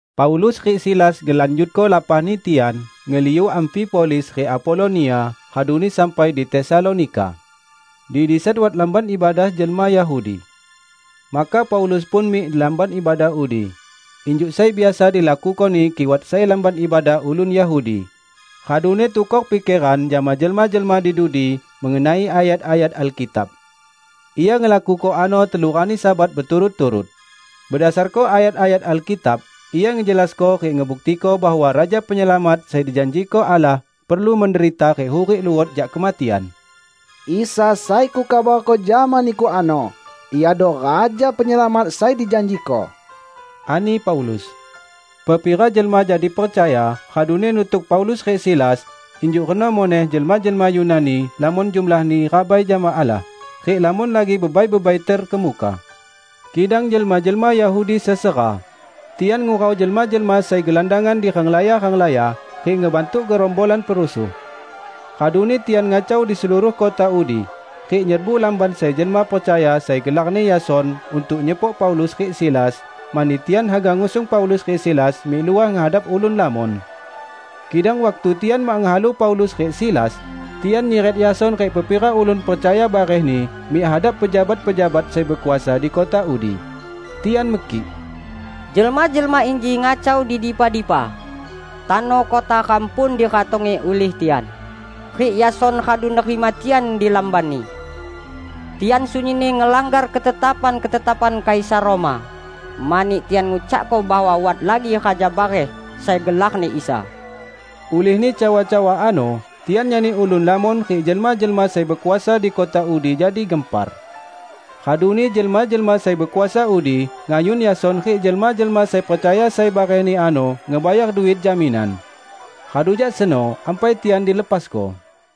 Paulus rik Silas ngelanjutko lapahni tian ngeliu Amfipolis rik Apolonia raduni sampai di Tesalonika. Di disan wat lamban ibadah jelma Yahudi. Maka Paulus pun mik di lamban ibadah udi -- injuk sai biasa dilakukoni kik wat sai lamban ibadah ulun Yahudi -- raduni tukor pikeran jama jelma-jelma di dudi mengenai ayat-ayat Alkitab. Ia ngelakuko ano telu rani Sabat beturut-turut. Bedasarko ayat-ayat Alkitab ia ngejelasko rik ngebuktiko bahwa Raja Penyelamat sai dijanjiko Allah perlu menderita rik hurik luot jak kematian. "Isa sai kukabarko jama niku ano, Iado Raja Penyelamat sai dijanjiko," ani Paulus. Pepira jelma jadi percaya raduni nutuk Paulus rik Silas; injuk reno muneh jelma-jelma Yunani lamon jumlahni rabai jama Allah, rik lamon lagi bebai-bebai terkemuka. Kidang jelma-jelma Yahudi sesera. Tian ngurau jelma-jelma sai gelandangan di renglaya-renglaya rik ngebantuk gerombolan perusuh. Raduni tian ngacau di seluruh kota udi rik nyerbu lamban sai jelma percaya sai gelarni Yason untuk nyepok Paulus rik Silas, mani tian haga ngusung Paulus rik Silas mik luah ngehadap ulun lamon. Kidang waktu tian mak ngehalu Paulus rik Silas, tian nyiret Yason rik pepira ulun percaya barehni mik hadap pejabat-pejabat sai bekuasa di kota udi. Tian mekik, "Jelma-jelma inji ngacau di dipa-dipa! Tano kota ram pun diratongi ulih tian, rik Yason radu nerima tian di lambanni. Tian sunyinni ngelanggar ketetapan-ketetapan Kaisar Roma, mani tian ngucakko bahwa wat lagi raja bareh sai gelarni Isa." Ulihni cawa-cawa ano tian nyani ulun lamon rik jelma-jelma sai bekuasa di kota udi jadi gempar. Raduni jelma-jelma sai bekuasa udi ngayun Yason rik jelma-jelma sai percaya sai barehni ano ngebayar duit jaminan. Radu jak seno ampai tian dilepasko.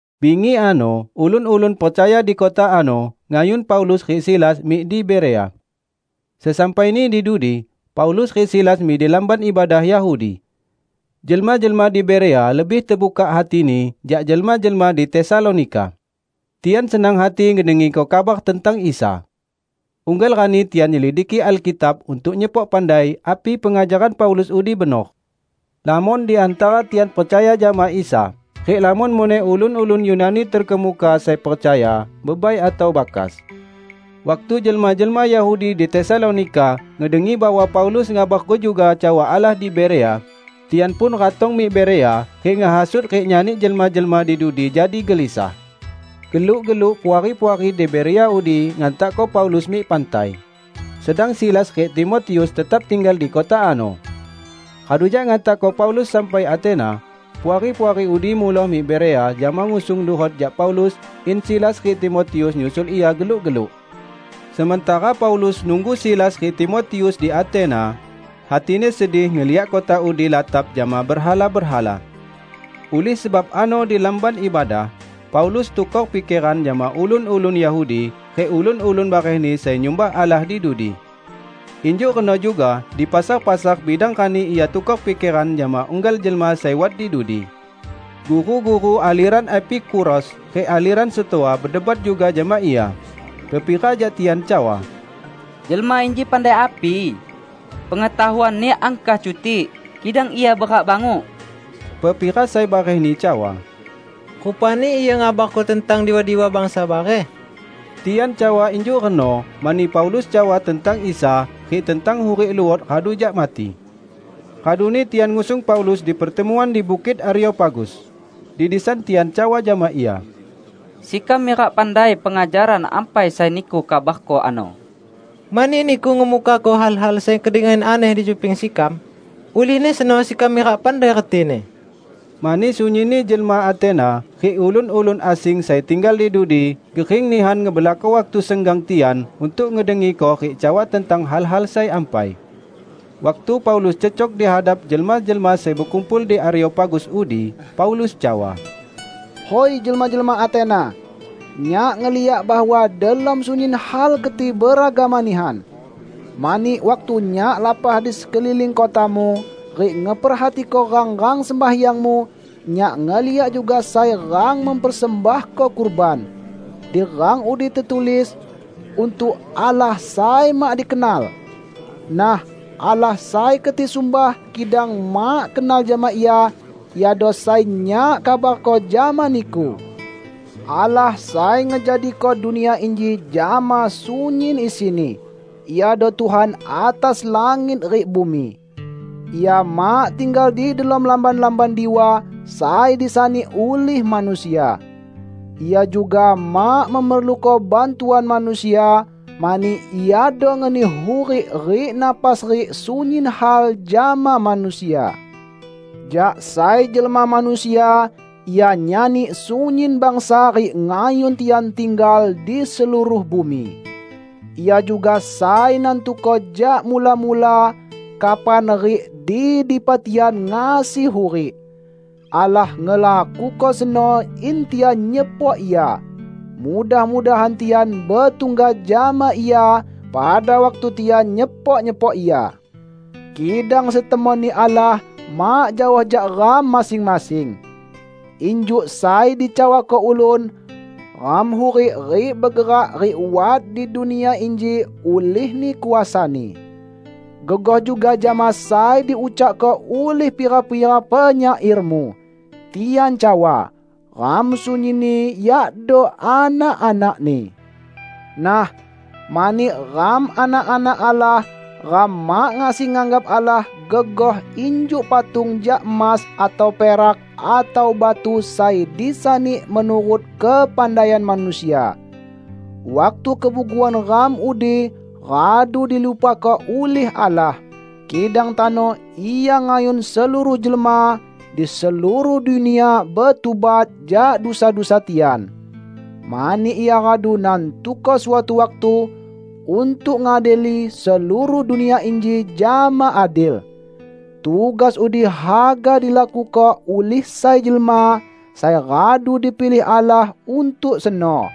Bingi ano ulun-ulun percaya di kota ano ngayun Paulus rik Silas mik di Berea. Sesampaini di dudi, Paulus rik Silas mik di lamban ibadah Yahudi. Jelma-jelma di Berea lebih tebukak hatini jak jelma-jelma di Tesalonika. Tian senang hati ngedengiko kabar tentang Isa, unggal rani tian nyelidiki Alkitab untuk nyepok pandai api pengajaran Paulus udi benor. Lamon di hantara tian percaya jama Isa, rik lamon muneh ulun-ulun Yunani terkemuka, sai percaya; bebai atau bakas. Waktu jelma-jelma Yahudi di Tesalonika ngedengi bahwa Paulus ngabarko juga cawa Allah di Berea, tian pun ratong mik Berea rik ngehasut rik nyani jelma-jelma di dudi jadi gelisah. Geluk-geluk puari-puari di Berea udi ngantakko Paulus mik pantai, sedang Silas rik Timotius tetap tinggal di kota ano. Radu jak ngantakko Paulus sampai Atena, puari-puari udi muloh mik Berea jama ngusung luhot jak Paulus in Silas rik Timotius nyusul ia geluk-geluk. Sementara Paulus nunggu Silas rik Timotius di Atena, hatini sedih ngeliak kota udi latap jama berhala-berhala. Ulih sebab ano di lamban ibadah, Paulus tukor pikeran jama ulun-ulun Yahudi rik ulun-ulun barehni sai nyumbah Allah di dudi. Injuk reno juga di pasar-pasar bidang rani ia tukor pikeran jama unggal jelma sai wat di dudi. Guru-guru aleran Epikuros rik aleran Stoa bedebat juga jama ia. Pepira jak tian cawa, "Jelma inji pandai api? Pengetahuanni angkah cutik, kidang ia berak banguk!" Pepira sai barehni cawa, "Rupani ia ngabarko tentang diwa-diwa bangsa bareh." Tian cawa injuk reno, mani Paulus cawa tentang Isa rik tentang hurik luot radu jak mati. Raduni tian ngusung Paulus di pertemuan di Bukit Areopagus. Di disan tian cawa jama ia, "Sekam mirak pandai pengajaran ampai sai niku kabarko ano. Mani niku ngemukako hal-hal sai kedengian aneh di cuping sekam. Ulihni seno sekam mirak pandai retini." ( Mani sunyinni jelma Atena rik ulun-ulun asing sai tinggal di dudi gering nihan ngebelako waktu senggang tian untuk ngedengiko rik cawa tentang hal-hal sai ampai.) Waktu Paulus cecok di hadap jelma-jelma sai bekumpul di Areopagus udi, Paulus cawa, "Hui jelma-jelma Atena! Nyak ngeliak bahwa delom sunyin hal keti beragama nihan. Mani waktu nyak lapah di sekeliling kotamu rik ngeperhatiko rang-rang sembahyangmu, nyak ngeliak juga sai rang mempersembahko kurban; di rang udi tetulis, 'Untuk Allah Sai Mak Dikenal!' Nah, Allah sai keti sumbah kidang mak kenal jama Ia, Iado sai nyak kabarko jama niku. Allah sai ngejadiko dunia inji jama sunyin isini, Iado Tuhan atas langit rik bumi. Ia mak tinggal di delom lamban-lamban diwa sai disani ulih manusia. Ia juga mak memerluko bantuan manusia, mani Iado ngeni hurik rik napas rik sunyin hal jama manusia. Jak sai jelma manusia Ia nyani sunyin bangsa rik ngayun tian tinggal di seluruh bumi. Ia juga sai nantuko jak mula-mula, kapan rik di dipa tian ngasi hurik. Allah ngelakuko seno in tian nyepok Ia. Mudah-mudahan tian betungga jama Ia pada waktu tian nyepok-nyepok Ia. Kidang setemonni Allah mak jaoh jak ram masing-masing. Injuk sai dicawako ulun, 'Ram hurik rik begerak rik wat di dunia inji ulihni kuasa-Ni.' Gegoh juga jama sai diucakko ulih pira-pira penyairmu. Tian cawa, 'Ram sunyinni yakdo anak-anak-Ni.' Nah, mani ram anak-anak Allah, ram mak ngasi nganggap Allah gegoh injuk patung jak emas atau perak atau batu sai disani menurut kepandaian manusia. Waktu kebuguan ram udi radu dilupako ulih Allah, kidang tano Ia ngayun seluruh jelma di seluruh dunia betubat jak dusa-dusa tian. Mani Ia radu nantuko suatu waktu untuk ngadili seluruh dunia inji jama adil. Tugas udi haga dilakuko ulih sai jelma sai radu dipilih Allah untuk seno.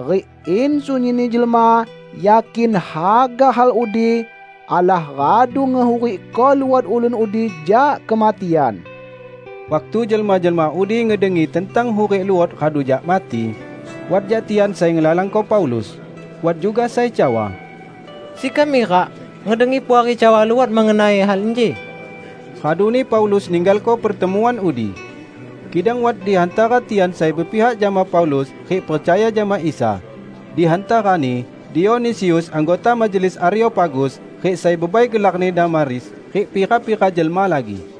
Rik in sunyinni jelma yakin haga hal udi, Allah radu ngehurikko luot ulun udi jak kematian!" Waktu jelma-jelma udi ngedengi tentang hurik luot radu jak mati, wat jak tian sai ngelalangko Paulus. Wat juga sai cawa, "Sekam mirak ngedengi Puari cawa luot mengenai hal inji." Raduni Paulus ninggalko pertemuan udi. Kidang wat di hantara tian sai bepihak jama Paulus rik percaya jama Isa, di hantarani: Dionisius anggota majelis Areopagus, rik sai bebai gelarni Damaris, rik pira-pira jelma lagi.